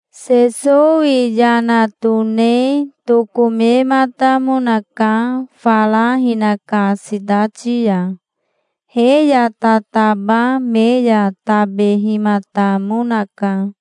Sesowi yana tone tokomematamonaka fara hinaka sitati ya. He ya tataba me ya tabehimatamonaka.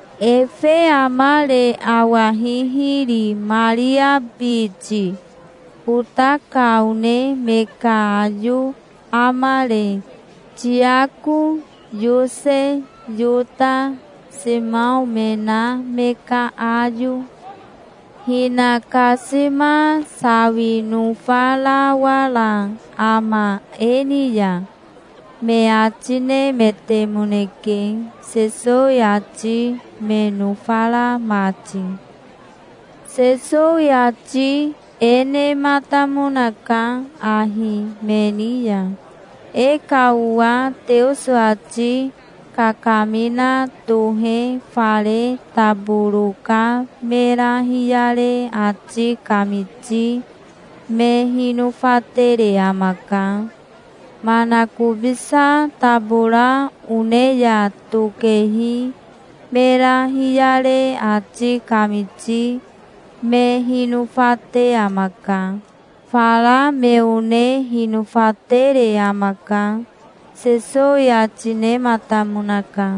Efe amare awa hihiri, Maria biti? Ota ka one me ka ayo amare, Tiako, Yose, Yota, Simao me na me ka ayo? Hinakasima sawi nofarawara ama e ni ya?" me ati nemetemoneke, Sesowi ati me nofara mati. Sesowi ati e nematamonaka ahi me ni ya: "E ka owa Teoso ati kakamina tohe fare taboro ka mera hiyare ati kamiti me hinofatere amaka. Manakobisa tabora one ya tokehi mera hiyare ati kamiti me hinofate amaka. Fara me one hinofatere amaka", Sesowi ati nematamonaka.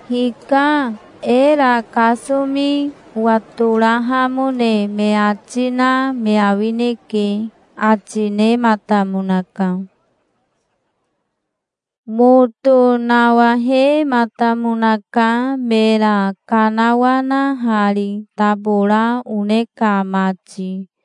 "Hika, era kasomi owatorahamone me ati na me awineke", ati nematamonaka. Moto nawahematamonaka mera kanawanahari tabora one ka mati.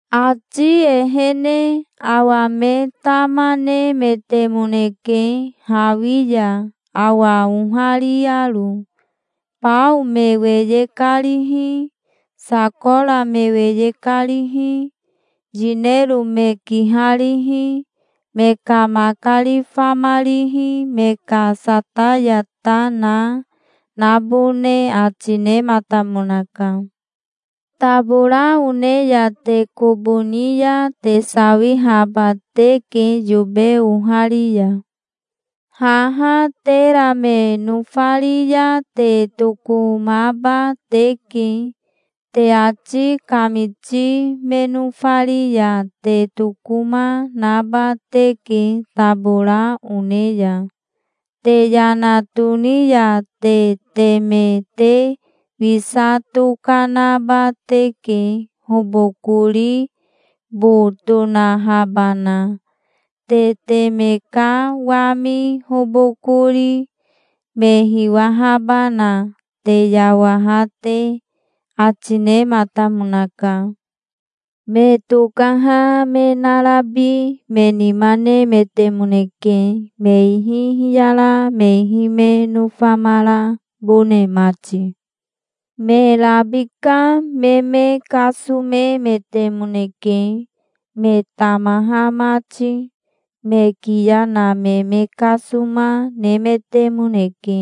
Ati ehene awa me tama nemetemoneke hawi ya awa ohariaro. Bao me weye karihi, sakora me weye karihi, yinero me kiharihi, me ka makari famarihi, me ka sataya ta na, nabone ati nematamonaka. "Tabora one ya te kobo ni ya te sawihaba teke yobe ohari ya. Haha tera me nofari ya te tokomaba teke. Te ati kamiti me nofari ya te tokoma, naba teke tabora one ya. Te yana toni ya te teme te wisa tokanaba teke, hobokori bo tonahabana, te teme ka wami hobokori, me hiwahabana, te yawaha te", ati nematamonaka. Me tokaha me narabi me nima nemetemoneke me ihi hiyara me ihi me nofamarabone mati. Me rabika me me kasomemetemoneke me tamaha mati. Me kiya na me me kasoma nemetemoneke,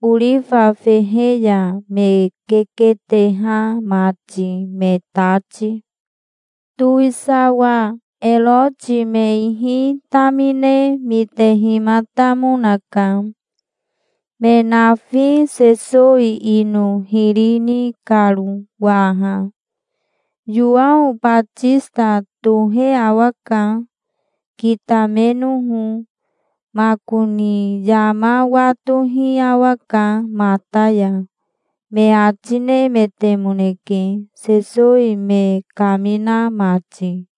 orifa fehe ya me keketeha mati me tati. Towisawa Eroti me ihi tamine mitehimatamonaka, me nafi Sesowi ino hiri ni karo, waha. "Yowao Batisita tohe awaka, kitamenoho. Makoni yama watohi awaka mata ya", me ati nemetemoneke Sesowi me kamina mati.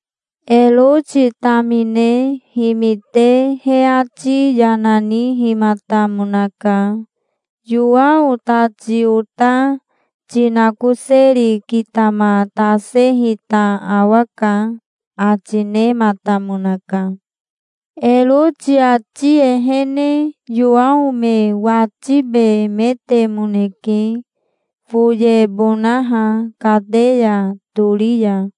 Eroti tamine himite he ati yana nihimatamonaka. "Yowao tati ota ti nakoseri kitamatasehita awaka", ati nematamonaka. Eroti ati ehene Yowao me watibemetemoneke foyebonaha kateya tori ya,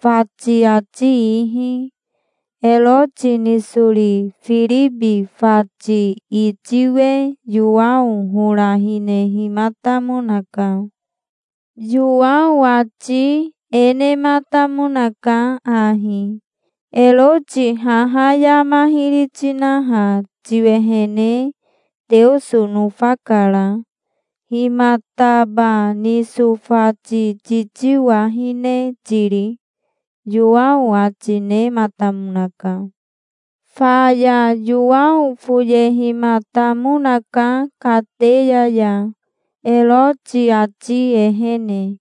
fati ati ihi. Eroti nisori Firibi fati itiwe Yowao hora hinehimatamonaka. Yowao ati e nematamonaka ahi: "Eroti haha yama hiri tinaha tiwehene Teoso nofakara. Himataba niso fati titiwahine tiri?" Yowao ati nematamonaka. Faya Yowao foyehimatamonaka kateya ya Eroti ati ehene,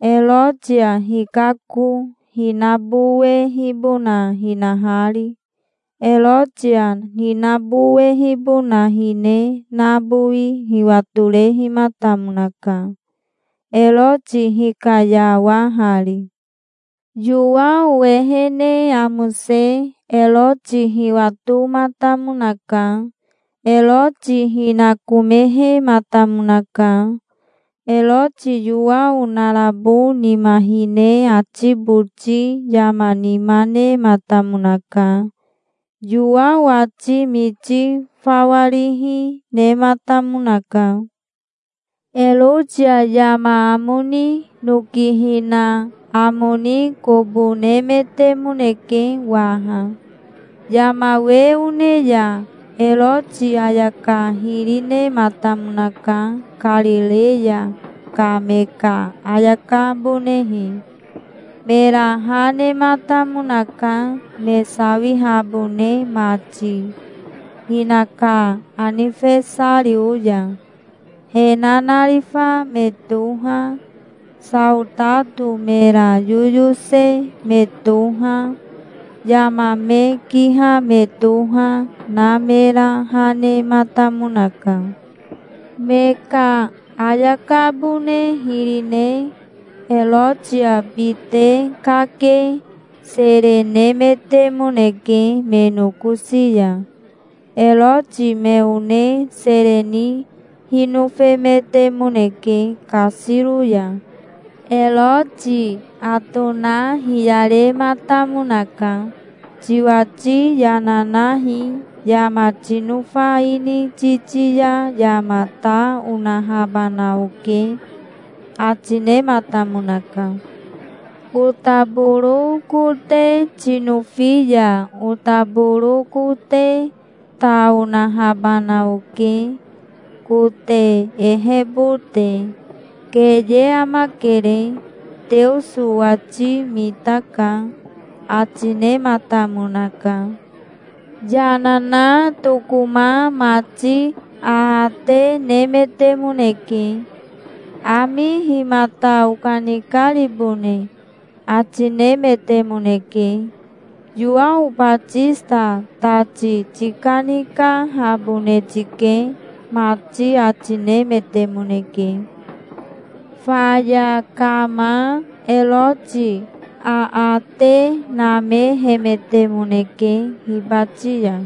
Erotia hikako hinabowehibona hinahari. Erotia hinabowehibona hine nabowi hiwatorehimatamonaka, Eroti hikayawahari. Yowao ehene amose Eroti hiwatomatamonaka. Eroti hinakomehematamonaka. Eroti Yowao narabo nima hine ati boti yama nima nematamonaka. Yowao ati miti fawa rihi nematamonaka. Erotia yama amo ni noki hina amo ni kobo nemetemoneke waha. Yama we one ya Eroti ayaka hiri nematamonaka, Karireya ka me ka ayakabonehe. Mera ha nematamonaka, me sawihabone mati, hinaka anifesario ya. He nanarifa me toha, saotato mera yoyose me toha, yama me kiha me toha, na mera ha nematamonaka. Me ka ayakabone hiri ne Erotia bite kake sere nemetemoneke me nokosi ya. Eroti me one sere ni hinofemetemoneke kasiro ya. Eroti atona hiyarematamonaka. "Tiwati yana nahi. Yama tinofa ini titi ya yama ta onahabana oke", ati nematamonaka. "Otaboro kote tinofi ya otaboro kote ta onahabana oke, kote ehebote. Keye amakere. Teoso owati mitaka", ati nematamonaka. Yana na tokoma mati aate nemetemoneke. "Ami himata okanikaribone?" ati nemetemoneke. "Yowao Batisita tati tikanikahabone tike", mati ati nemetemoneke. Faya kama Eroti aate namehemetemoneke hibati ya.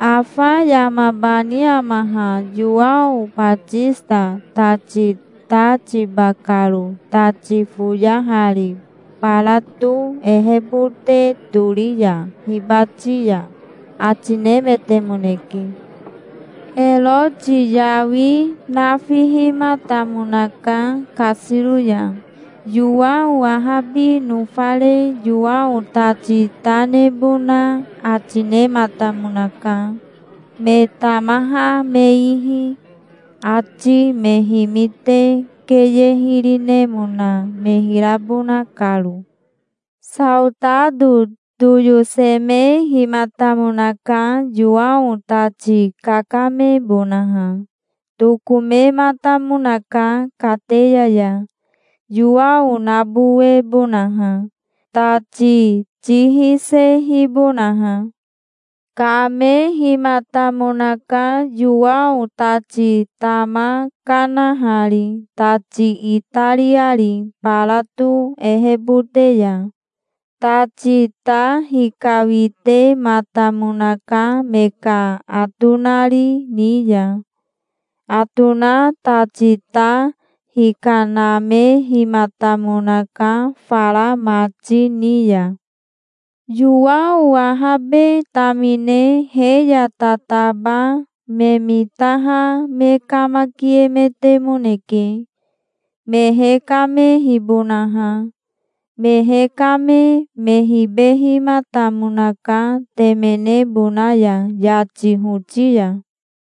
"Afa yamabani ama ha, Yowao Batisita tati ta tiba karo tati foyahari barato ehebote tori ya hibati ya", ati nemetemoneke. Eroti yawi nafihimatamonaka kasiro ya. Yowao ahabi nofare Yowao tati ta nebona ati nematamonaka, me tamaha me ihi, he ati me mitaha mati, keye hiri nemona me hirabona karo. Saotato toyosemehimatamonaka Yowao tati kakamebonaha. Tokomematamonaka kateya ya Yowao nabowebonaha, tati ti hisehibonaha. Kamehimatamonaka Yowao tati tama kanahari tati itariari barato ehebote ya. Tati ta hikawitematamonaka me ka atonari ni ya. Atona tati ta hikanamehimatamonaka fara mati ni ya. Yowao ahabe tamine he ya tataba me mitaha me kamakiemetemoneke, me hekamehibonaha. Me hekame me hibehimatamonaka temenebona ya, yati hoti ya.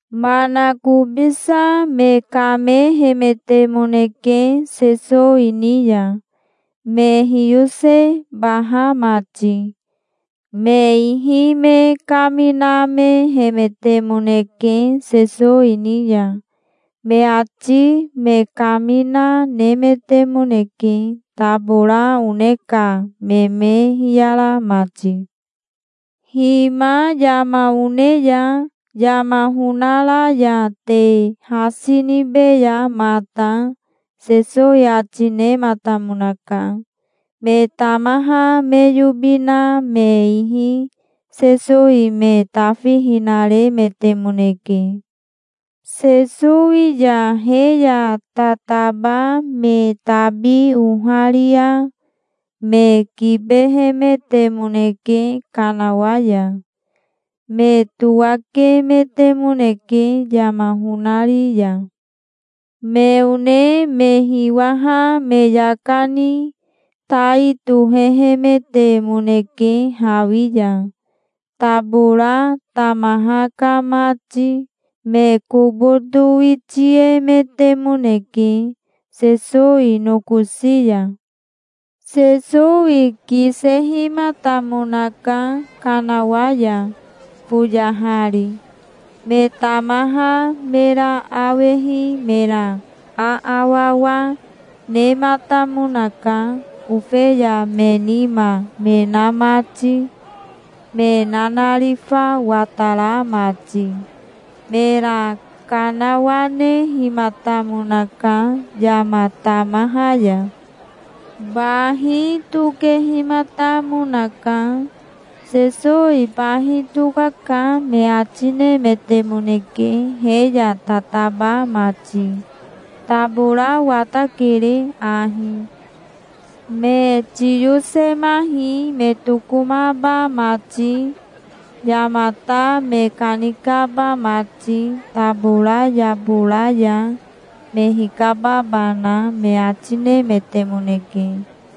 Manakobisa me kamehemetemoneke Sesowi ni ya, me hiyosebaha mati. Me ihi me kaminamehemetemoneke Sesowi ni ya. Me ati me kamina nemetemoneke, tabora one ka me me hiyara mati. "Hima yama one ya. Yama honara ya te hasi nibeya mata", Sesowi ati nematamonaka. Me tamaha me yobi na me ihi Sesowi me tafihinaremetemoneke. Sesowi ya he ya tataba me tabi oharia me kibehemetemoneke kanawa ya. Me towakemetemoneke yama honari ya. Me one me hiwaha me yaka ni tai tohehemetemoneke hawi ya, tabora tamaha ka mati. Me kobo towitiemetemoneke, Sesowi nokosi ya. Sesowi kisehimatamonaka kanawa ya foyahari. Me tamaha mera awehi mera aawawa nematamonaka, ofeya me nima me na mati, me nanarifa watara mati. Mera kanawanehimatamonaka yama tamaha ya. Bahi tokehimatamonaka. "Sesowi bahi tokaka", me ati nemetemoneke, he ya tataba mati. "Tabora watakere ahi. Me tiyosemahi me tokomaba mati yamata me kanikaba mati tabora yabora ya, me hikababana", me ati nemetemoneke.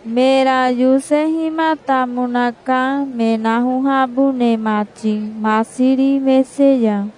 Mera yosehimatamonaka me nahohabone mati masiri mese ya.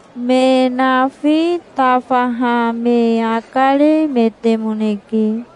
Me nafi tafaha me akaremetemoneke.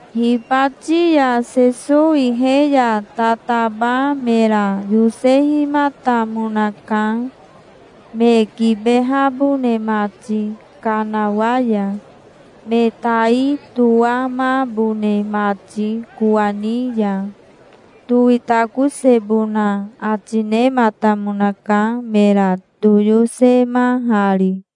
Hibati ya Sesowi he ya tataba mera yosehimatamonaka, me kibehabone mati kanawa ya, me tai toamabone mati kowani ya. Towitakosebona ati nematamonaka, mera toyosemahari.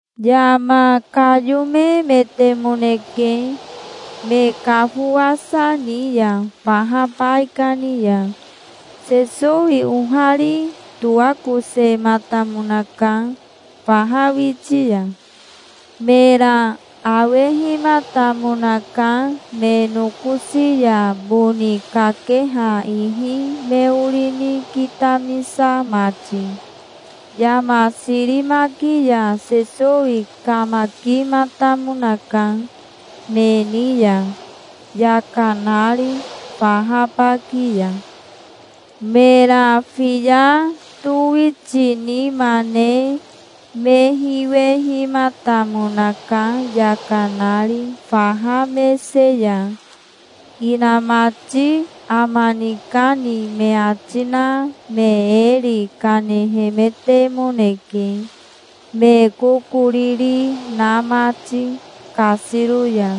Yama kayomemetemoneke, me kafowasa ni ya faha baikani ya. Sesowi ohari toakosematamonaka, faha witi ya. Mera awehimatamonaka, me nokosi ya boni kakeha ihi me ori ni kitamisa mati. Yama sirimaki ya Sesowi kamakimatamonaka, me ni ya, yaka nari, faha baki ya. Mera fiya towitinima ne me hiwehimatamonaka, yaka nari, faha mese ya. Inamati ama nikani me ati na me eri kanehemetemoneke, me kokoriri na mati kasiro ya.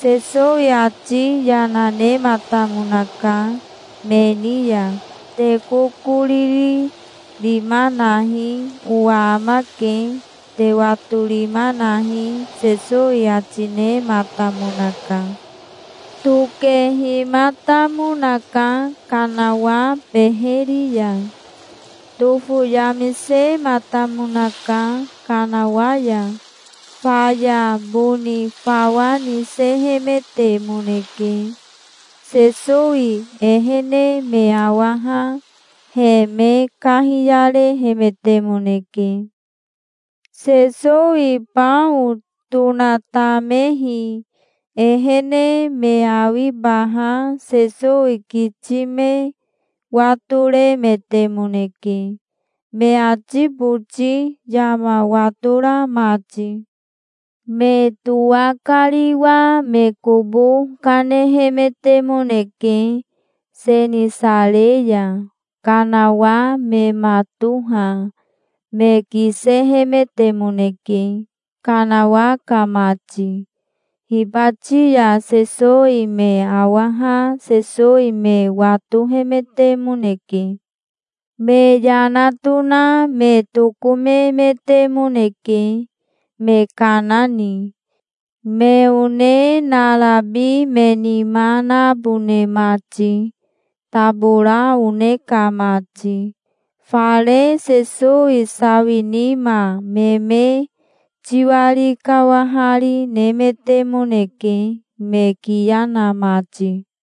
Sesowi ati yana nematamonaka me ni ya. "Te kokoriri rima nahi. Owa amake. Te watorima nahi", Sesowi ati nematamonaka. Tokehimatamonaka, kanawa beheri ya. Tofoyamisematamonaka, kanawa ya. Faya boni fawa nisehemetemoneke. Sesowi ehene me awaha he me kahiyarehemetemoneke. Sesowi bao tonatamehi ehene me awibaha Sesowi kiti me watoremetemoneke, me ati boti yama watora mati. Me towakariwa me kobo kanehemetemoneke, Senisare ya. Kanawa me matoha me kisehemetemoneke, kanawa ka mati. Hibati ya Sesowi me awaha Sesowi me watohemetemoneke. Me yana tona me tokomemetemoneke, me kana ni, me one narabi me nima nabone mati, tabora one ka mati. Fare Sesowi sawi nima me me tiwari kawahari nemetemoneke, me kiya na mati.